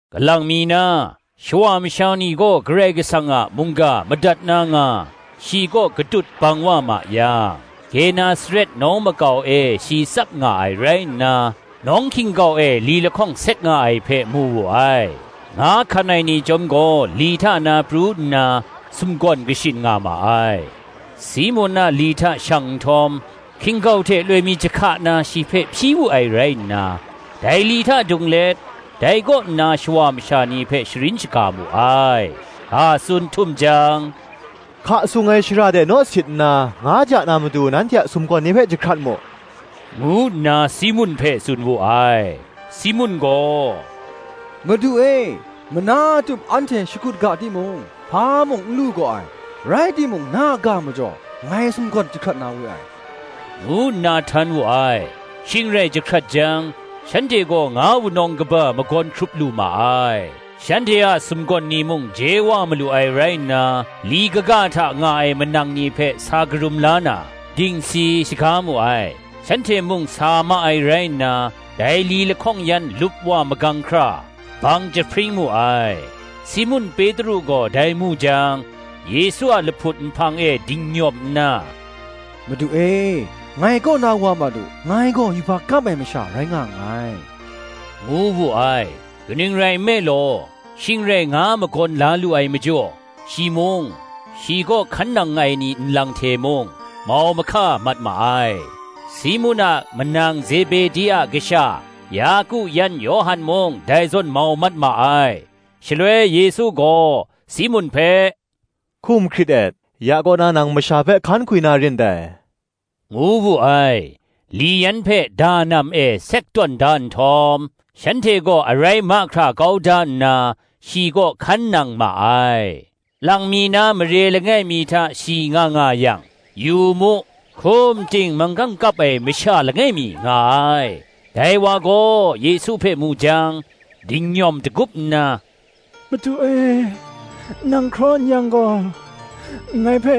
Kalang mi na, shawa masha ni gaw Karai Kasang a mungga madat na nga, shi kaw katut bang wa ma yang, Genesaret nawng makau e shi tsap nga ai rai nna, nawng hkin-gau e li lahkawng sek nga ai hpe mu wu ai: nga hkan ai ni chyawm gaw li hta na pru nna, sumgawn kashin nga ma ai. Simun a li hta shang nhtawm, hkin-gau hte loi mi jahka na shi hpe hpyi wu ai rai nna, dai li hta dung let, dai kaw nna shawa masha ni hpe sharin shaga mu ai. Ga tsun htum jang, “Hka sung ai shara de naw sit nna, nga ja na matu nanhte a sumgawn ni hpe jahkrat mu,” ngu nna Simun hpe tsun wu ai. Simun gaw, “Madu e, mana tup anhte shakut ga timung, hpa mung n lu gaw ai, rai timung na a ga majaw, ngai sumgawn jahkrat na we ai,” ngu nna htan wu ai. Shing rai jahkrat jang, shanhte gaw nga wunawng kaba magawn hkrup lu ma ai; shanhte a sumgawn ni mung je wa malu ai rai nna, li kaga hta nga ai manang ni hpe sa karum la na, dingsi shaga mu ai. Shanhte mung sa ma ai rai nna, dai li lahkawng yan lupwa magang hkra, bang jahpring mu ai. Simun Petru gaw dai mu jang, Yesu a lahput nhpang e dingnyawm nna, “Madu e, ngai kaw na wa mat u; ngai gaw yubak kap ai masha rai nga nngai,” ngu wu ai. Kaning rai nme law, shing rai nga magawn la lu ai majaw, shi mung, shi kaw hkan nang ai ni nlang hte mung, mau mahka mat ma ai; Simun a manang Zebedi a kasha Yaku yan Yawhan mung dai zawn mau mat ma ai. Shaloi Yesu gaw, Simun hpe, “Hkum hkrit et; ya kaw nna nang masha hpe hkan hkwi na rin dai,” ngu wu ai. Li yan hpe danam e sek tawn da nhtawm, shanhte gaw arai mahkra kau da nna, shi kaw hkan nang ma ai. Lang mi na mare langai mi hta shi nga nga yang, yu mu, hkum ting manggang kap ai masha langai mi nga ai: dai wa gaw Yesu hpe mu jang, dingnyawm dagup nna, “Madu e, nang hkraw n-yang gaw, ngai hpe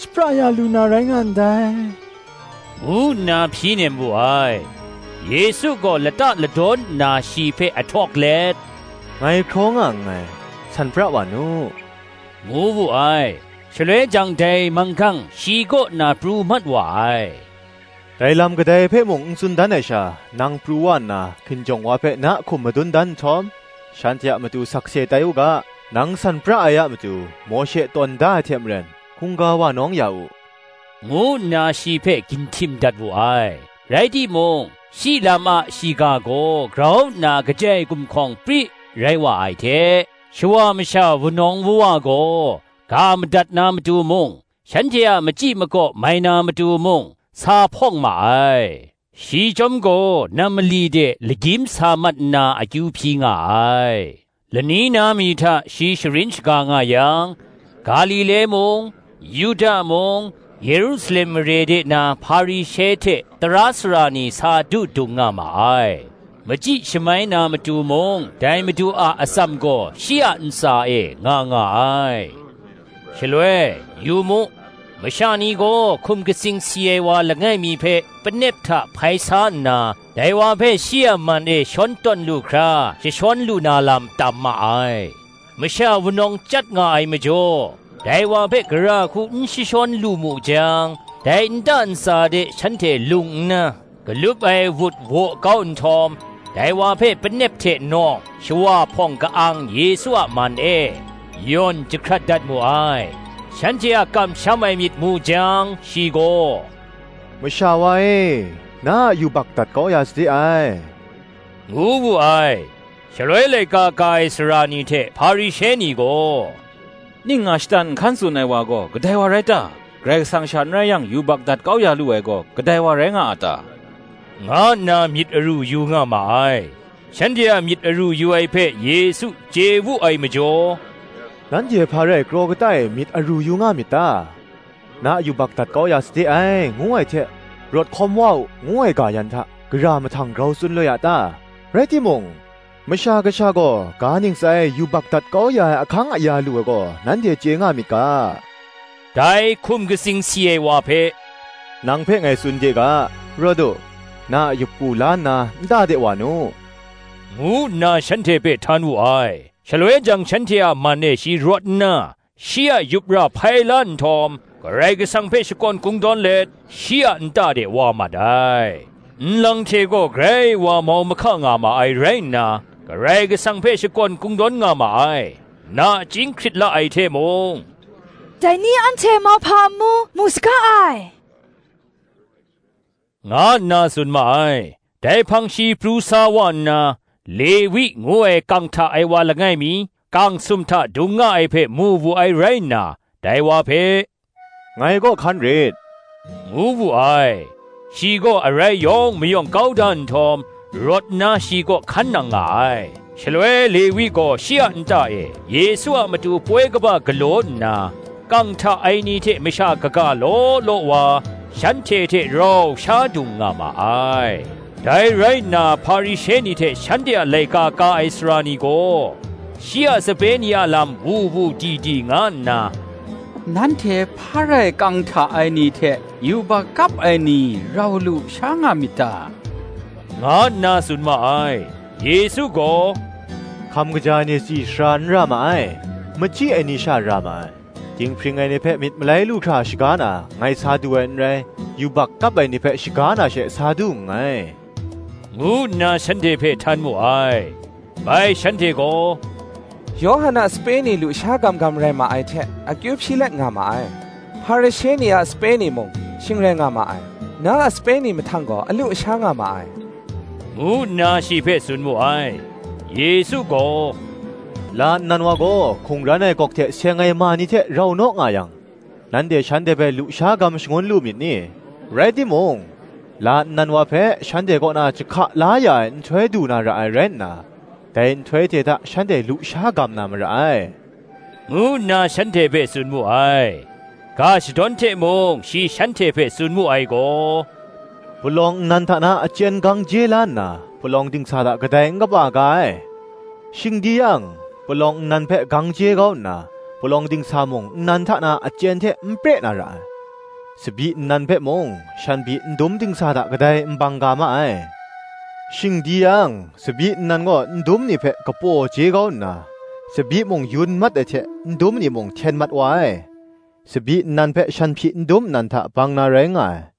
shapra ya lu na rai nga ndai,” ngu nna hpyi nem wu ai. Yesu gaw lata ladawn nna shi hpe ahtawk let, “Ngai hkraw nga nngai, san pra wa nu,” ngu wu ai. Shaloi jang dai manggang shi kaw na pru mat wa ai. “Dai lam kadai hpe mung n tsun dan ai sha, Nang pru wa nna hkinjawng wa hpe na hkum madun dan nhtawm, shanhte a matu sakse tai u ga, nang san pra ai a matu Mawshe tawn da ai hte maren, hkungga wa nawng ya u,” ngu nna shi hpe ginhtim dat wu ai. Rai timung, shi a shiga gaw grau nna kajai gumhkawng pri rai wa ai hte, shawa masha wunawng wuwa gaw, ga madat na matu mung, Shanhte a machyi makaw mai na matu mung, sa hpawng ma ai. shi chyawm gaw nam mali de lagyim sa mat nna akyu hpyi nga ai. Lani mi hta shi sharin shaga nga yang, Galile mung, Yuda mung, kahtawng shagu hkan na hte, Yerusalem mare de na Hparishe hte tara sara ni sa du dung nga ma ai: machyi shamai na matu mung dai Madu a atsam gaw shi a ntsa e nga nga ai. Shaloi, yu mu, masha ni gaw hkum katsing si ai wa langai mi hpe panep hta hpai sa nna, dai wa hpe shi a man e shawn tawn lu hkra jashawn lu na lam tam ma ai. Masha wunawng chyat nga ai majaw, dai wa hpe gara hku n jashawn lu mu jang, dai nta ntsa de shanhte lung nna, galup ai wut waw kau nhtawm, dai wa hpe panep hte nawng, shawa hpawng ka-ang Yesu a man e, yawn jahkrat dat mu ai. Shanhte a kamsham ai myit mu jang, shi gaw, “Masha wa e, na a yubak dat kau ya sade ai,” ngu wu ai. Shaloi laika ka ai sara ni hte Hparishe ni gaw, “Ning nga shatan nhkan tsun ai wa gaw, kadai wa rai ta? Karai Kasang sha n rai yang yubak dat kau ya lu ai gaw kadai wa rai nga a ta?” nga nna myit aru yu nga ma ai. Shanhte a myit aru yu ai hpe Yesu chye wu ai majaw, “Nanhte hpa rai kraw kata e myit aru yu nga myit ta? Na yubak dat kau ya sade ai, ngu ai hte, Rawt hkawm wa u, ngu ai ga yan hta, gara mahtang grau tsun loi a ta? Rai timung, Masha Kasha gaw ga ntsa e yubak dat kau ya ai ahkang aya lu ai gaw nanhte chye nga myit ga, dai hkum katsing si ai wa hpe, Nang hpe ngai tsun de ga, ‘Rawt u, na a yup ra la nna, nta de wa nu,” ngu nna shanhte hpe htan wu ai. Shaloi jang shanhte a man e shi rawt nna, shi a yup ra hpai la nhtawm, Karai Kasang hpe shakawn kungdawn let, shi a nta de wa mat ai. Nlang hte gaw grai wa mau mahka nga ma ai rai nna, Karai Kasang hpe shakawn kungdawn nga ma ai; nachying hkrit la ai hte mung, “Dai ni anhte mauhpa amu mu saga ai,” nga nna tsun ma ai. Dai hpang shi pru sa wa nna, Lewi ngu ai kang hta ai wa langai mi, kang sum hta dung nga ai hpe mu wu ai rai nna, dai wa hpe, “Ngai kaw hkan rit,” ngu wu ai. Shi gaw arai yawng mayawng kau da nhtawm, rawt nna shi kaw hkan nang nga ai. Shaloi Lewi gaw shi a nta e Yesu a matu poi kaba galaw nna, kang hta ai ni hte masha kaga law law wa, shanhte hte rau sha dung nga ma ai. Dai rai nna Hparishe ni hte shanhte a laika ka ai sara ni gaw, shi a sape ni a lam wu wu di di nga nna, “Nanhte hpa rai kang hta ai ni hte yubak kap ai ni rau lu sha nga myit ta?” nga nna tsun ma ai. Yesu gaw, “Hkam kaja ai ni tsi sara n ra ma ai, machyi ai ni sha ra ma ai: dinghpring ai ni hpe myit malai lu hkra shaga na, ngai sa du ai n rai, yubak kap ai ni hpe shaga na she, sa du nngai,” ngu nna shanhte hpe htan mu ai. Bai shanhte gaw, Yawhan a sape ni lusha gam gam rai ma ai hte akyu hpyi let nga ma ai: Hparishe ni a sape ni mung shing rai nga ma ai: na a sape ni mahtang gaw alu asha nga ma ai, ngu nna shi hpe tsun mu ai. Yesu gaw, “La nnan wa gaw hkungran ai gawk hte seng ai ma ni hte rau naw nga yang, nanhte shanhte hpe lusha gam shangun lu myit ni? Rai timung, la nnan wa hpe shanhte kaw na jahka la ya ai nhtoi du na ra ai rai nna, dai nhtoi hte hta shanhte lusha gam na mara ai,” ngu nna shanhte hpe tsun mu ai. Ga shadawn hte mung shi shanhte hpe tsun mu ai gaw, “Palawng nnan hta na achyen gang je la nna, palawng dingsa hta kadai n kapa ga ai; shing di yang, palawng nnan hpe gang je kau nna palawng dingsa mung nnan hta na achyen hte n pre na ra ai. Tsabyi nnan hpe mung shanhpyi ndum dingsa hta kadai n bang ga ma ai; shing di yang, tsabyi nnan gaw ndum ni hpe kapaw je kau nna, tsabyi mung yun mat ai hte ndum ni mung hten mat wa ai. Tsabyi nnan hpe shanhpyi ndum nnan hta bang na rai nga ai.